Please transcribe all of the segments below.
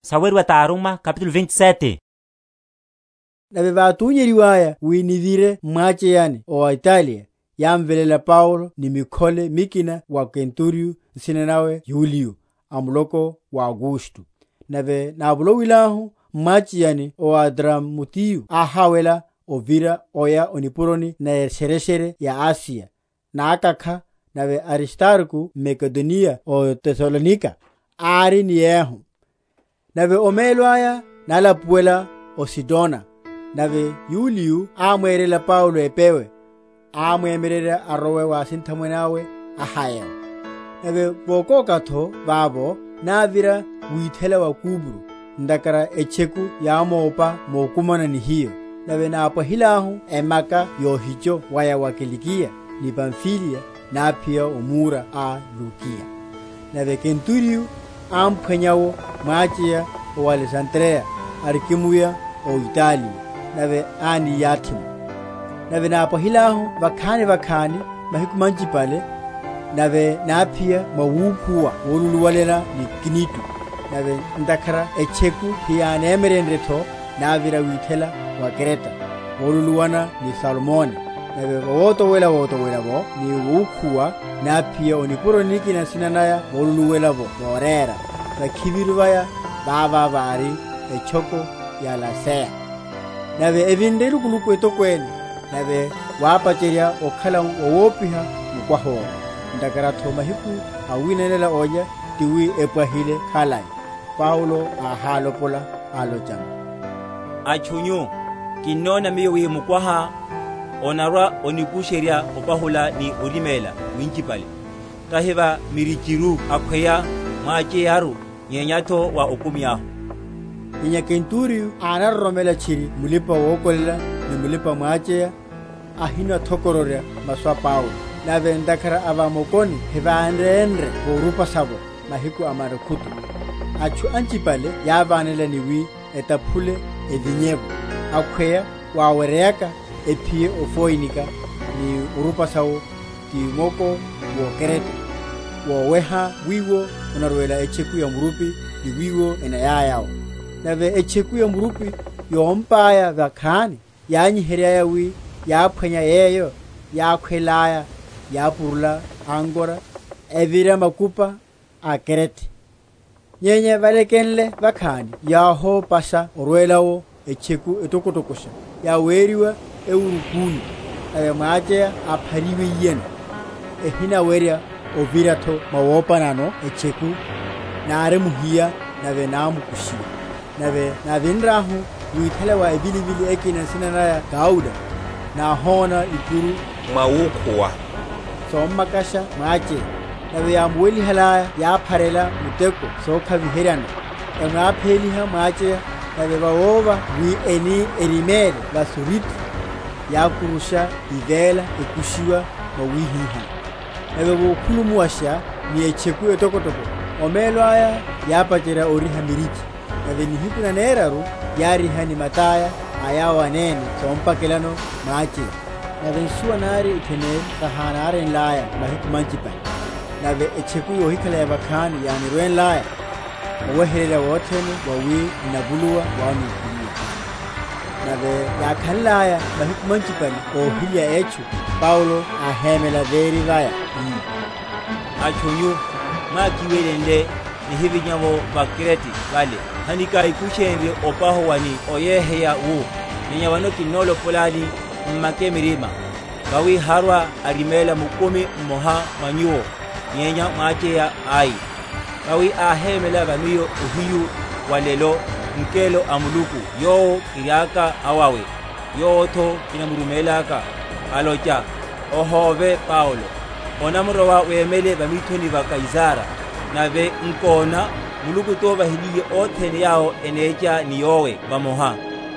Orumihiwa wa Paulo o Roma. Nave vátunyeryiwaya wi nivire m’mwacheyani o Italiya, yámveléla Paulo ni mikhole mikina wa kenturiyo nsina nawe Yuliyo, a muloko wa Augusto. Nave návolowilahu m’mwacheyani ó Adramutiyo áháwela ovira oya o nipuroni neshereshere ya Asiya, nákakha, nave Aristarko mMakedoniya ó Tesalonika, ári ni yehu. Nave omelo aya nálapuwela o Sidona; nave Yuliyo ámwerela Paulo epewe, amwemyererya arowe wa asinthamwene awe ahaye’wo. Nave voka?-?kha’tho vavo, návira withela wa Kupro, ntakhara etcheku yámopa mokumana ni hiyo. Nave nápwahilahu emaka yohicho waya wa Kilikiya ni Pamfiliya, náphiya o Mura a Lukiya. Nave kenturiyo ámphwanya’wo mwacheya a o Alesandriya, arikimuya o Italiya, nave ániyathi’mo. Nave nápwahilahu vakhani?-?vakhani mahiku manchipale, nave náphiya mwawukhuwa voluluwelana ni Knido; nave ntakhara etcheku heyánemyerenrye’tho, návira withela wa Krete, voluluwelana ni Salmone; nave vawotowela‐otowela’vo ni wukhuwa náphiya o nipuroni nikina nsina naya Volapuwela’vo Vorera; vakhiviru vaya vava vári etchoko ya Laseya. Nave evinre elukuluku etokwene, nave wápacherya okhala wawopiha mukwaha owo, ntakhara’tho mahiku awinanela olya tiwi epwahile khalai, Paulo áhálopola, alochano, Atchu nyu, Kinnona miyo wi mukwaha onarwa‐onikusherya opahula ni oriméla winchipale, tahi wa mirichiru akhweya mwacheyaru, nyenya’tho wa okumi ahu. Nyenya Kenturiyo ánaroromela tchiri mulipa‐wokolela ni mulipa‐mwacheya, ahinathokororya masu a Paulo. Nave ntakhara va mokoni hevárenre vorupasa’vo mahiku a nakhutu, atchu anchipale yávanela ni wi etaphule evinye’vo, akhweya waweryeyaka ephiye o Foinika, ni orupasa’wo, ti moko wó Krete, woweha wiwo onarwela etcheku ya murupi ni wiwo eniyaya’wo. Nave etcheku ya murupi yómpaya vakhani, yányiheryaya wi yáphwanya yeyo yákhwelaya, yápurula ankora, evira makupa a Krete. Nyenya valekenle vakhani yáhopasha orwela’wo etcheku etokotokosha, yaweriwa Eurokulo: nave mwacheya áphariwiyeno, ehinawerya ovira’tho mwawopanano etcheku, nárimuhiya, nave námkushiwa. Nave návi?-?nrahu withela wa evilivili ekhani nsina naya Kauda, náhona ikuru, mwawukhuwa, sommakasha mwacheya; nave yámuwelihalaya yápharela muteko sokhaviheryano, emwapheliha mwacheya; nave vawova wi eni eriméle va Surti, yákurusha ivela ekushiwa mwawihiha. Nave vokhulumuwasha ni etcheku etokotoko, omelo aya yápacherya oriha mirichi; nave nihiku naneraru yáriha ni mata’ya a yawo anene sompakelano mwacheya. Nave nsuwa nari itheneri sahánaryenlaya mahiku manchipale, nave etcheku yohikhala ya vakhani yánirwenlaya, oweheryerya wothene wawi n’navuluwa wánukuluwa vano. Nave yákhanlaya mahiku manchiene óhilya etchu, Paulo áhémela véri vaya, ii, Atchu nyu, mwákiwelenle, nihivinya’vo va Krete vale, hanakikushenrye opahuwa ni oyeheya wu. Nyenya vano kinnolopolani m’make mirima; vawi harwa‐ariméla mukumi mmoha mwa nyuwo, nyenya mwacheya ai. Vawi áhémela va miyo ohiyu wa’lelo ngelo a Muluku yowo kiriaka awawe, yowo’tho kinamurumélaka, alocha, Ohóve Paulo; onamurowa wemele va mithoni va Kaisara; nave, nkona, Muluku tovahiliye othene yawo enecha ni yowe vamoha.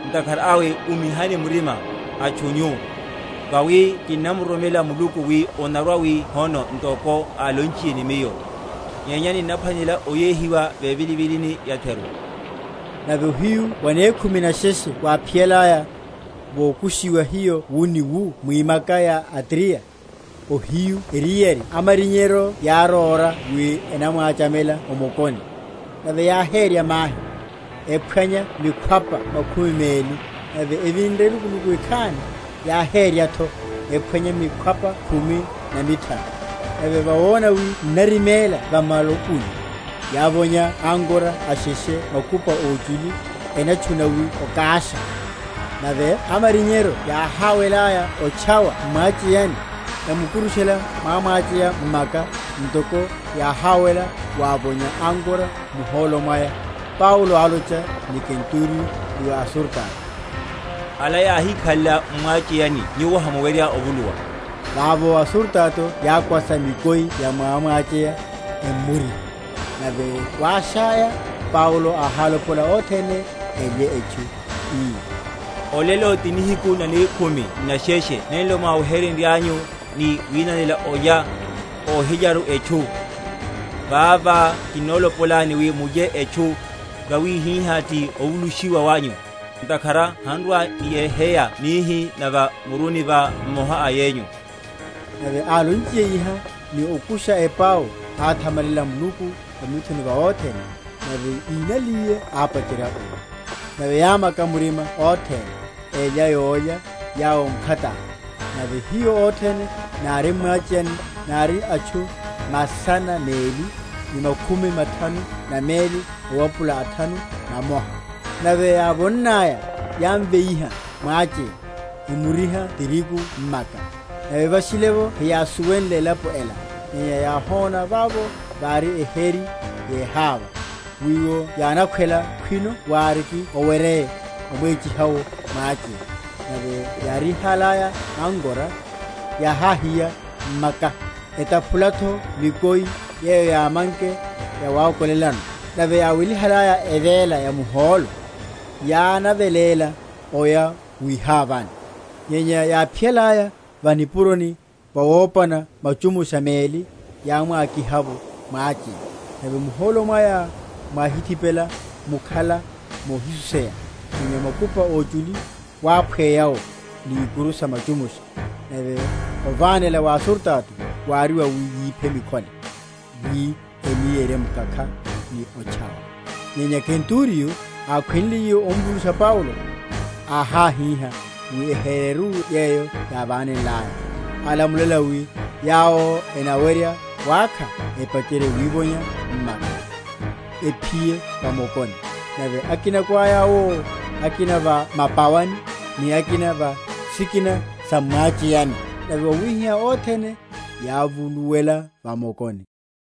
Ntakhara awe, umihani murima, atchu nyu; vawi kinnamuroromela Muluku, wi onarwa‐wi hono ntoko álonchiye ni miyo. Nyenya ninnaphwanela oyéhiwa vevilivilini yatheru. Nave ohiyu wanekhumi nesheshe waphiyalaya, vokushiwa hiyo wu ni wu mwimaka ya Adriya, ohiyu eriyari amarinyero yáróra wi enamwachamela o mokoni; nave yáhérya mahi, ephwanya mikhwapa makhumi meli; nave evinre elukuluku ekhani, yáhérya’tho, ephwanya mikhwapa khumi na mithanu. Nave vawona wi n’nariméla va malukuni, yávonya ankora asheshe makupa óchuli, enatchuna wi okásha. Nave amarinyero yáháwelaya otchawa m’mwacheyani, emukurushela mwamwacheya m’maka, ntoko yáháwela wavonya ankora muhólo mwaya, Paulo álocha ni kenturiyo ni wa asurutato, Ala yáhikhalela m’mwacheyani nyuwo hamuwerya ovuluwa. Vavo asurutato yákwasa mikoi ya mwamwacheya, emmoriha. Nave wáshaya, Paulo áhálopola othene elye etchu, ii, Olelo ti nihiku nanekhumi n’nesheshe nenlo mwáwe?-?henryanyu ni winanela yólya, ohilyaru etchu. Vavá kinnolopolani wi mulye etchu; vawi hihá ti ovulushiwa wanyu; ntakhara han’rwa‐niyeheya nihi na va muruni wa mmoha a yenyu. Nave álonchiye iha, ni okusha epau, áthamalela Muluku va mithoni va othene; nave ínnaliye ápacherya olya. Nave yámaka murima othene, elya yólya yawo m’khataya. Nave hiyo othene nári m’mwacheyani nári atchu masana meli ni makhumi mathanu na meli owapula athanu na mmoha. Nave yávonnaya, yámveiha mwacheya, emuriha tirigu m’maka. Nave vashile’vo heyásuwenle elapo ela; nyenya yáhona vavo vári eheri yeháva; wiwo yánakhwela khwino wáriki oweryeye, omwechiha’wo mwacheya. Nave yárihalaya ankora yáháhiya m’maka, etaphula’tho mikoi yeyo yámanke yawokolelano; nave yáwelihalaya evela yamuhólo, yánavéla oya wihávani. Nyenya yáphiyalaya va nipuroni vawopana machumusha meli, yámwakiha’vo mwacheya; nave muhólo mwaya mwáhithipela, mukhala mohisuseya, nyenya makupa óchuli wáphweya’wo ni ikuru sa machumusha. Nave ovanéla wa asurutato wári wawi yiphe mikhole, wi eni yeremwákha, ni otchawa. Nyenya kenturiyo, ákhwenliye omvulusha Paulo, áháhíha wi ehereru yeyo yávanenlaya; alamulela wi yawo enawerya wákha epacherye wivonya m’maka, ephiye va mokoni; nave akinako aya’wo, akina va mapawani, ni akina va sikina sa m’mwacheyani. Nave wáhihihá wi othene yávuluwela va mokoni.